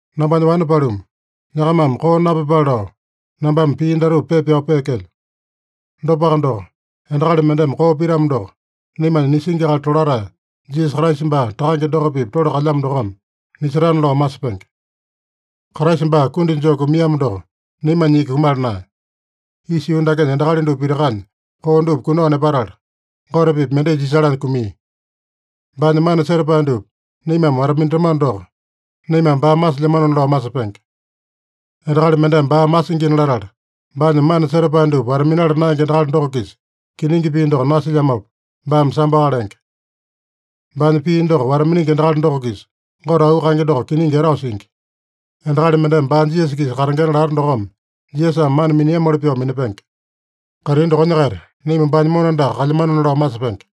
Nambanya wane paluma, nyakamame koo napyepale lao nambame pii datupa pepa pyao peekelyo. Dopaka doko, endakali mendeme koo pitamo doko, naimanya nisingi akali tolatae Jisasa Kraisa baa Takange doko-pipa tole kalyamo dokome nisetana lao masepenge. Kraisa baa kundi joo kumiamo doko, naimanya iki kumala naeya. Isa yuu dakenya endakali dupa pitakanya koo dupa kunao nepatala, Gote-pipa mendai jisalanya kumia. Baanya mana setapae dupa naimame wata-minatamano doko, naimame baa masilyamanona lao masepenge. Endakali mendeme baa masingina latala, baanya mana setapae dupa wata-minala naenge endakali doko-kisa kiningi pii doko nasilyamopa, baame samboaka lenge. Baanya pii doko wata-miningi endakali doko-kisa Gote auu kaenge doko kiningi etao singi. Endakali mendeme baa Jisasa-kisa katengena lata dokome, Jisasame mana miniamoli pyoo minapenge. Kaitini dokonya-kaita naima baanya mona andaka kalyamanona lao masepenge.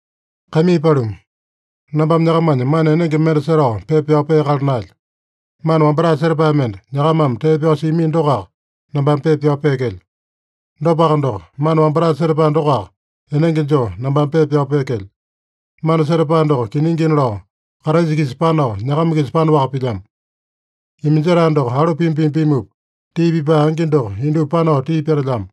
Kaimii paluma, nambame nyakamanya mana enenge mende setao pepa pyao peakala naelyo. Mana wambatae setapae mende, nyakamame tee pyao siamino dokoaka, nambame pepa pyao peekelyo. Dopaka doko, mana wambatae setapae dokoaka enenge joo nambame pepa pyao peekelyo. Mana setapae doko kiningina lao Kraisa-kisa panao, nyakama-kisa panaowaka pilyamo. Iminjetae doko alu pima-pima pimupa, tii pipae angi doko indupa panao tii petelyamo.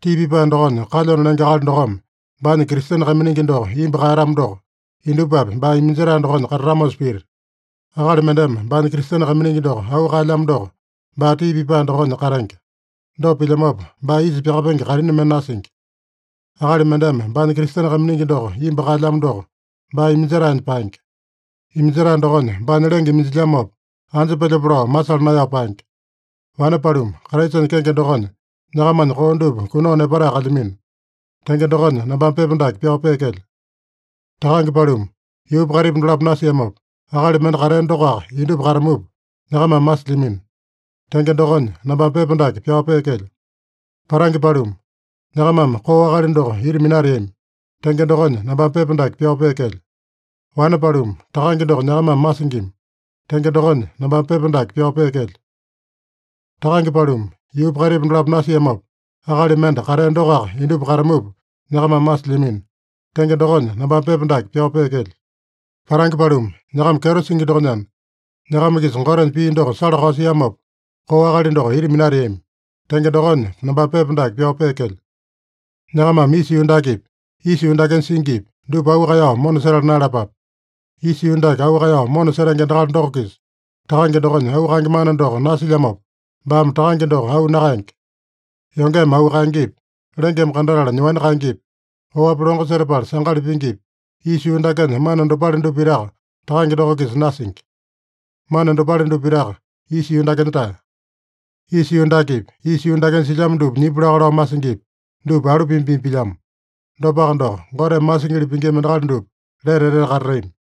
Tii pipae dokonya kalyona lenge akali dokome baanya Kristene kaiminingi doko imbu kaeyatamo doko, indupapi baa iminjetae dokonya katatamosa pita. Akali mendeme baanya Kristene kaiminingi doko auu kaelyamo doko, baa tii pipae dokonya katenge. Dopa pilyamopa, baa isa pyakapenge kaitini mende nasingi. Akali mendeme baanya Kristene kaiminingi doko imbu kaelyamo doko, baa iminjetaenya paenge. Iminjetae dokonya baanya lenge iminjilyamopa, anja pelyope lao masala naeyao paenge. Wane paluma, Kraisanya kenge dokonya, nyakamanya koo dupa kunao nepatae kalyamino. Tenge dokonya, nambame pepa dake pyao peekelyo. Takange paluma, yuupa kaitipa dolapo nasiamopa, akali mende katea dokoaka indupa katamupa, nyakamame masilyamino. Tenge dokonya, nambame pepa dake pyao peekelyo. Patange paluma, nyakamame koo akali doko ita minateami. Tenge dokonya, nambame pepa dake pyao peekelyo. Wane paluma, Takange doko nyakamame masingima. Tenge dokonya, nambame pepa dake pyao peekelyo. Takange paluma, yuupa kaitipa dolapo nasiamopa, akali mende katea dokoaka indupa katamupa, nyakamame masilyamino. Tenge dokonya, nambame pepa dake pyao peekelyo. Patange paluma, nyakama kyeto singi dokonyana, nyakama-kisa Gotenya pii doko sala-kao siamopa, koo akali doko ita minateami. Tenge dokonya, nambame pepa dake pyao peekelyo. Nyakamame isa yuu dakepi, isa yuu dakenya singipi, dupa auu kaeyao mona setala naeyalapape. Isa yuu dake auu kaeyao mona setenge endakali doko-kisa Takange dokonya auu kaenge mana doko nasilyamopa, baame Takange doko auu nakaenge. Yongeme auu kaengepi, lengeme kandatala nyoani kaengepi, oapi longo setapala sangali pingipi, isa yuu dakenya mana dopale dupa pitaka Takange doko-kisa nasingi. Mana dopale dupa pitaka isa yuu dakenya-tae. Isa yuu dakepi, isa yuu dakenya silyamo dupa nyipu laka lao masingipi, dupa alu pima-pima pilyamo. Dopaka doko, Goteme masingili pingima endakali dupa lete etete katatami.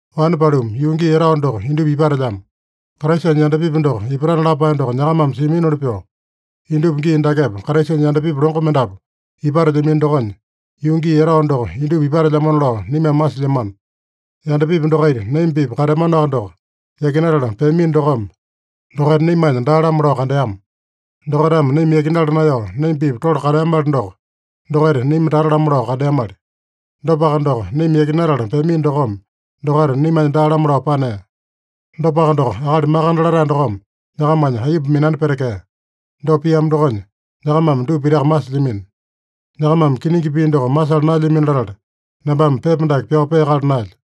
Wane paluma, yuu gii etao doko indupa ipatelyamo. Kraisanya yandapipi doko ipatana lapae doko nyakamame siaminoli pyoo, indupa gii dakepa Kraisanya yandapipi longo mendapu ipatelyamino dokonya, yuu gii etao doko indupa ipatelyamona lao naimame masilyamano. Yandapipi dokaita naima-pipa kateamanoaka doko, yakinatala peamino dokome, dokaita naimanya daa-lamo lao kandeama. Dokaitame naima yakinala naeyao naima-pipa tole kateamali doko, dokaita naima tata-lamo lao kandeamali. Dopaka doko, naima yakinatala peamino dokome, dokaita naimanya daa-lamo lao panea. Dopaka doko, Akali Makande Latae dokome nyakamanya aiyomba minani petekea. Dopa piamo dokonya, nyakamame dupa pitaka masilyamino. Nyakamame kiningi pii doko masala naelyamino latala, nambame pepa dake pyao peakala naelyo.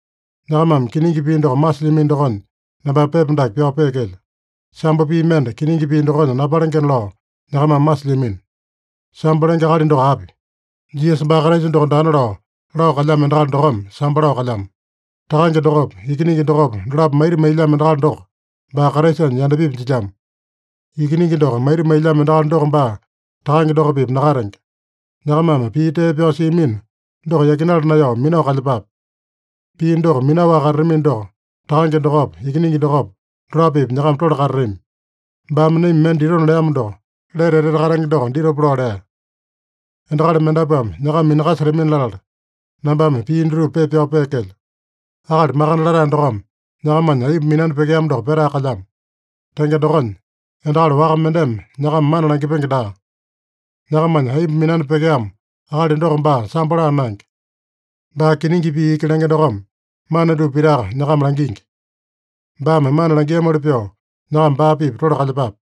Nyakamame kiningi pii doko masilyamino dokonya, nambame pepa dake pyao peekelyo. Sambo pii mende kiningi pii dokonya napalengena lao nyakamame masilyamino. Sambo lenge akali doko api? Jisasa baa Kraisa doko daana lao, lao kalyamo endakali dokome, sambo lao kalyamo. Takange dokopa, Ikiningi dokopa, dolapo maita mailyamo endakali doko, baa Kraisanya yandapipi jilyamo. Ikiningi doko maita mailyamo endakali doko baa Takange doko-pipa nakatenge. Nyakamame pii tee pyao siamino doko yakinala naeyao minao kalyepape. Pii doko minaowaka katatamino doko, Takange dokopa, Ikiningi dokopa, dolapo-pipa nyakama tole katatami. Baame naima mende ditona leamo doko, lete etete katenge doko ditopa lao lea. Endakali mendapuame nyakama minakasetamini-latala, nambame pii dutupa pepa pyao peekelyo. Akali Makande Latae dokome nyakamanya aiyomba minani pyekeamo doko petae kalyamo. Tenge dokonya, endakali waka mendeme nyakama mana langipenge daa. Nyakamanya aiyomba minani pyekeamo akali doko baa sambo laa naenge. Baa kiningi pii iki lenge dokome, mana dupa pitaka nyakama langingi. Baame mana langiamoli pyoo, nyakama baa-pipa tole kalyepape.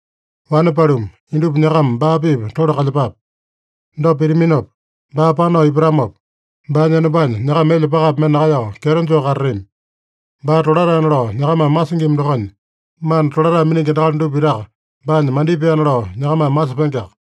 Wane paluma, indupa nyakama baa-pipa tole kalyepape. Dopa pitaminopa, baa panao ipatamopa, baanya enombanya nyakama elya pakapi mende nakaeyao kyeto joo katatami. Baa tolataena lao nyakamame masingima dokonya, mana tolatae miningi endakali dupa pitaka baanya mandipaena lao nyakamame masepengeaka.